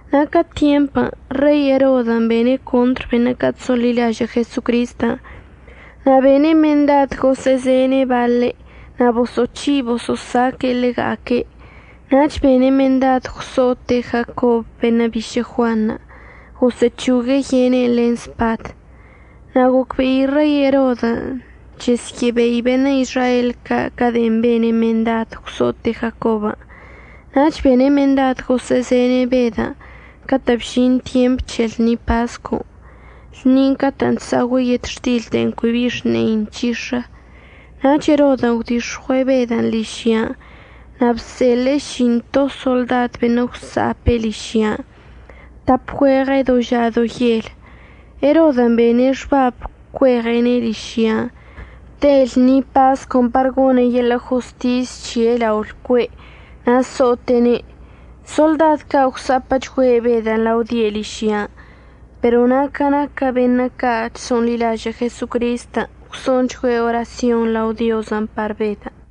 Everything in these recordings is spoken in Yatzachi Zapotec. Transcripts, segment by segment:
Na' ca tyempən' Rei Erodən' bene' contr beṉə' ca' chso'onḻilažə' Jesocristən' na' bene' mendad gosə'əzene' baḻe' na' boso'oc̱hi' boso'osaque'e ḻega'aque'. Nach bene' mendad gwso'ote' Jacob beṉə' bišə' Juanṉə' gosə'əc̱hogue' yene'en len spad. Na' gocbe'i Rei Erodən' chesyə'əbei beṉə' Izrael ca' de'en bene' mendad gwso'ote' Jacobən', nach bene' mendad gosə'əzene' Bedən' catə' bžin tyemp c̱he lṉi pascon', lṉin' catə'ən chsa'ogüe' yetxtil de'en cui bi xne'i nc̱hix̱ə. Nach Erodən' gwdix̱ɉue' Bedən' ližyan' na' bseḻe'e ši'into soḻdad beṉə' gwsa'ape' ližyan', tap güeɉe' do ža do yel. Erodən' bene' xbab cueɉe'ene' ližyan' te lṉi pascon' par gone' yeḻə' jostis c̱he' lao lcue' na' so'ote'ene'. Soḻdad ca' gwsa'apə'əchgüe' Bedən' lao die' ližyan', pero na' ca naquə beṉə' ca' chso'onḻilažə' Jesocristən' gwso'onchgüe' orasyon lao Diozən' par Bedən'.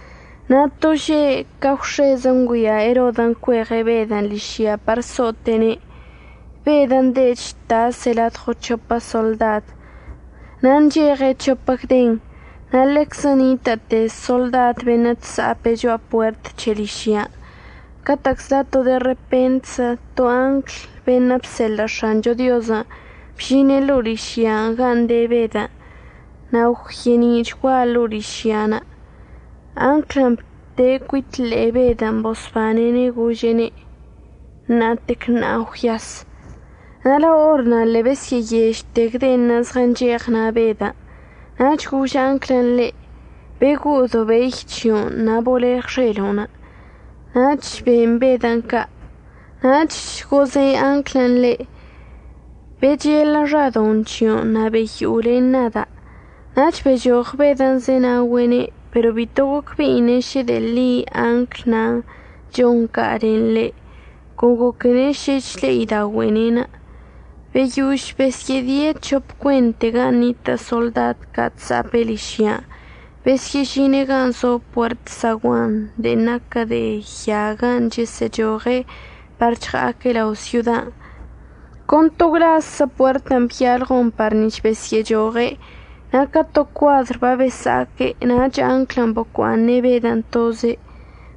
Na' to že' ca gwx̱ezə ngüia Erodən' cueɉe' Bedən' ližyan' par so'ote'ene', Bedən' de' chtase' ladɉo c̱hopə soḻdad na' ncheɉe' c̱hopə gden, na' ḻeczə nitə'əte soḻdad beṉə' chsa'ape' cho'a puert c̱he ližyan'. Catə'əczla to de repentzə to angl beṉə' bseḻə' X̱ancho Diozən' bžine' ḻo'o ližyan' gan' de Bedən', na' gwye'eni'ichgua ḻo'o ližyan'. Anglən' bte' cuit ḻe'e Bedən' bosbane'ene' gože'ene': ―Ṉa'atec ṉa'a gwyas. Na' lao or na' ḻe'e besyə'əyežte gdenṉə' zɉəncheɉ na' Bedən'. Nach gož anglən' ḻe': ―Bego'o dobey c̱hio'onə' na' boleɉ xelo'on. Nach ben Bedən' ca'. Nach goze' anglən' ḻe': ―Bechelə xadoṉ c̱hio'onə' na' beyo'o len nada'. Nach bechoɉ Bedən' zenaogüe'ene', pero bito gocbe'ine' šə de'e ḻi angl nan' chon ca' len ḻe', con goquene' šə chle'ida'ogüe'ene'. Beyož besyə'ədie' c̱hop cuente gan' nitə' soḻdad ca' chsa'ape' ližyan', besyə'əžine' gan' zo puert saguanṉə' de'en naquə de ya gan' chəsə'əchoɉe' par chɉa'aque' lao syodan', con to gwlazzə puertən' byalɉon par nic̱h besyə'əchoɉe', na' ca to cuadr babesa'aque' nach anglən' bocua'aṉe' Bedən' toze'.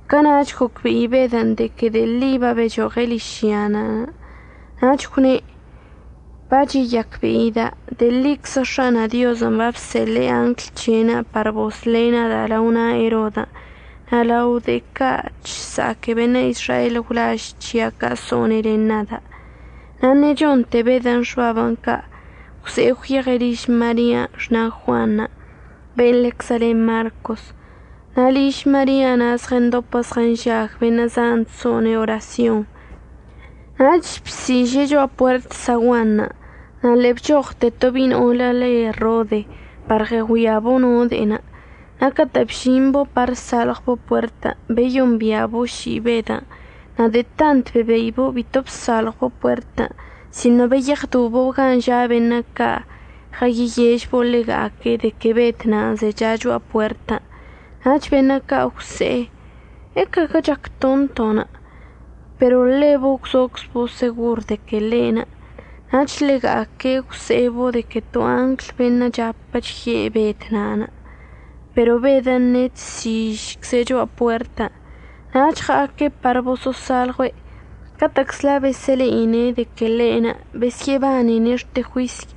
Cana'ach gocbe'i Bedən' de que de'e ḻi babechoɉe' ližyan', nach gwne': ―Bacheyacbe'ida' de'e ḻiczə X̱ana' Diozən' babseḻe'e angl c̱he'enə' par bosḻe' nada' lao na' Erodən' na' lao de'e ca' chsa'aque beṉə' Izrael gwlaž c̱hia' ca' so'one' len nada'. Na' ṉechonte Bedən' xbabən' ca' gwze'e gwyeɉe' liž Maria xna' Juan ben' ḻeczə le Marcos. Na' liž Maria na' zɉəndopə zɉənžag beṉə' zan chso'one' orasyon. Nach bsiže' cho'a puert saguanṉə' na' ḻe'e bchoɉte to bi'i no'olə le Rode par ɉəgüiabo' no de'enə'. Na' catə' bžimbo' par əsalɉwbo' puertən' beyombia'abo' ši'i Bedən' na' de'e tant bebeibo' bito bsalɉwbo' puertən' sino beyeɉdobo' gan' ža' beṉə' ca' ɉəyeyežbo' ḻega'aque' de que Bed nan' zecha cho'a puertən'. Nach beṉə' ca' gwse'e: ―¿Ecaguə chac tonto'onə'? Pero ḻebo' gwzoczbo' segor de que ḻe'enə'. Nach ḻega'aque' gwse'ebo' de que to angl beṉə' chapə chye' Bed na'anə'. Pero Bedən' ṉe'e chsižcze' cho'a puertən'. Nach ɉa'aque' par boso'osalɉue'. Catə'əczla besə'əle'ine' de que ḻe'enə' besyə'əbanene' xte juisy.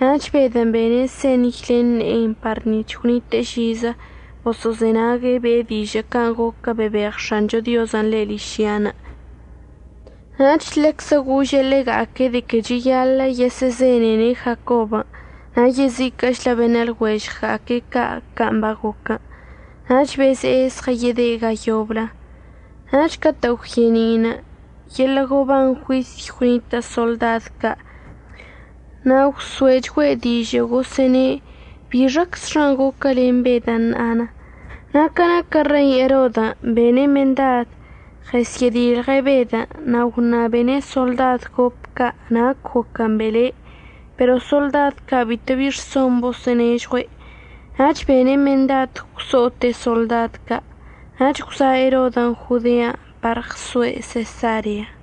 Nach Bedən' bene' señy len ne'enə' par nic̱h gwnite'e žizə boso'ozenague' be'e dižə' can' goquə bebeɉ X̱ancho Diozən' ḻe' ližyan'. Nach ḻeczə gože' ḻega'aque' de que cheyaḻə' yesə'əzenene' Jacobən' na' yeziquə'əchlə beṉə' lɉuežɉga'aque' ca' can' bagoquən'. Nach beze'e zɉəyede' ga yoblə. Nach catə' gwye'eni'inə' yeḻə' goban juisy gwnitə' soḻdad ca' na' gwso'echgüe' dižə' gosə'əne' bixaczxa goquə len Bed na'anə'. Na' ca naquə Rei Erodən', bene' mendad ɉəsyə'ədilɉe' Bedən' na' gwṉabene' soḻdad gop ca' nac goquən' bele'. Pero soḻdad ca' bitobi rson boso'onežɉue'. Nach bene' mendad gwso'ote' soḻdad ca'. Nach gwza' Erodən' Jodean' par ɉzoe' Sesarean'.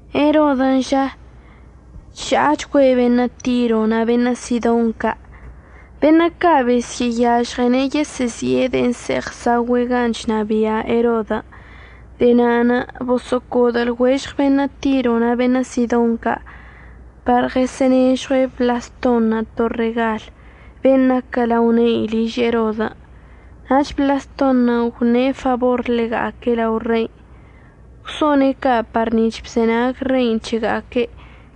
Erodən' ža, chža'achgüe' beṉə' Tiro na' beṉə' Sidon ca'. Beṉə' ca' besə'əyažɉene' yesə'əzi'e de'en əse'eɉ əsa'ogüe' gan' chnabia' Erodən'. De'e na'anə' boso'ocodə lɉuežɉ beṉə' Tiron' na' beṉə' Sidon ca' par ɉəsə'ənežɉue' Blaston' to regal, ben' naquə lao ne'i liž Erodən' nach Blaston' gwṉe' fabor ḻega'aque' lao rein'. Gwso'one' ca' par nic̱h bzenag rein' c̱hega'aque'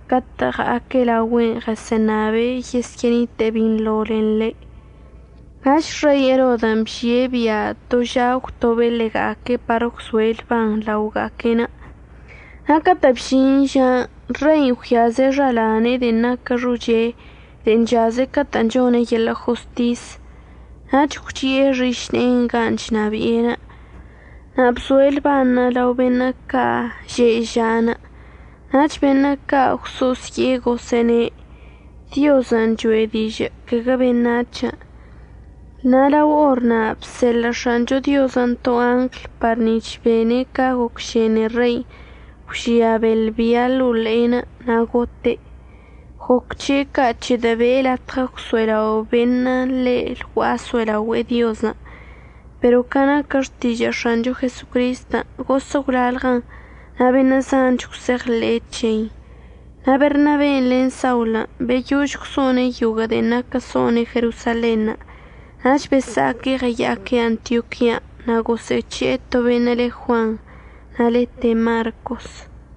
catə' ɉa'aque' laogüe'enə' ɉəsə'əṉabe' yesyə'ənite'e binḻo len ḻe'. Nach Rei Erodən' bžie' bia' to ža əgwtobe' ḻega'aque' par əgwzoe' lban laoga'aque'enə'. Na' catə' bžin žan' rein' gwyaze' xalane'e de'en naquə xoche de'en chaze' catə' chone' yeḻə' jostisən' nach gwchi'e xišne'e gan' chnabi'e na' bzoe' lban lao beṉə' ca' že'e ža'anə'. Nach beṉə' ca' gwso'osye'e gosə'əne': ―Diozən' cho'e dižə' caguə beṉac̱hən'. Na' lao or na' bseḻə' X̱ancho Diozən' to angl par nic̱h bene' ca gocšene rein' gwžia beḻ bia ḻo'o ḻe'enə' na' gote'. Goc c̱he' ca' c̱hedə' be'e latɉə gwso'elao' beṉə' ḻe' lgua'a əso'elaogüe'e Diozən'. Pero ca naquə xtižə' X̱ancho Jesocristən' gosə' gwlalɉəchən na' beṉə' zanch gwse'eɉḻe'e c̱hein'. Na' Bernaben' len Saulən' beyož gwso'one' yoguə' de'en naquə so'one' Jerosalenṉə' nach besa'aque' ɉəya'aque' Antioquian'. Na' gosə'əc̱he'e to beṉə' le Juan na' lete' Marcos.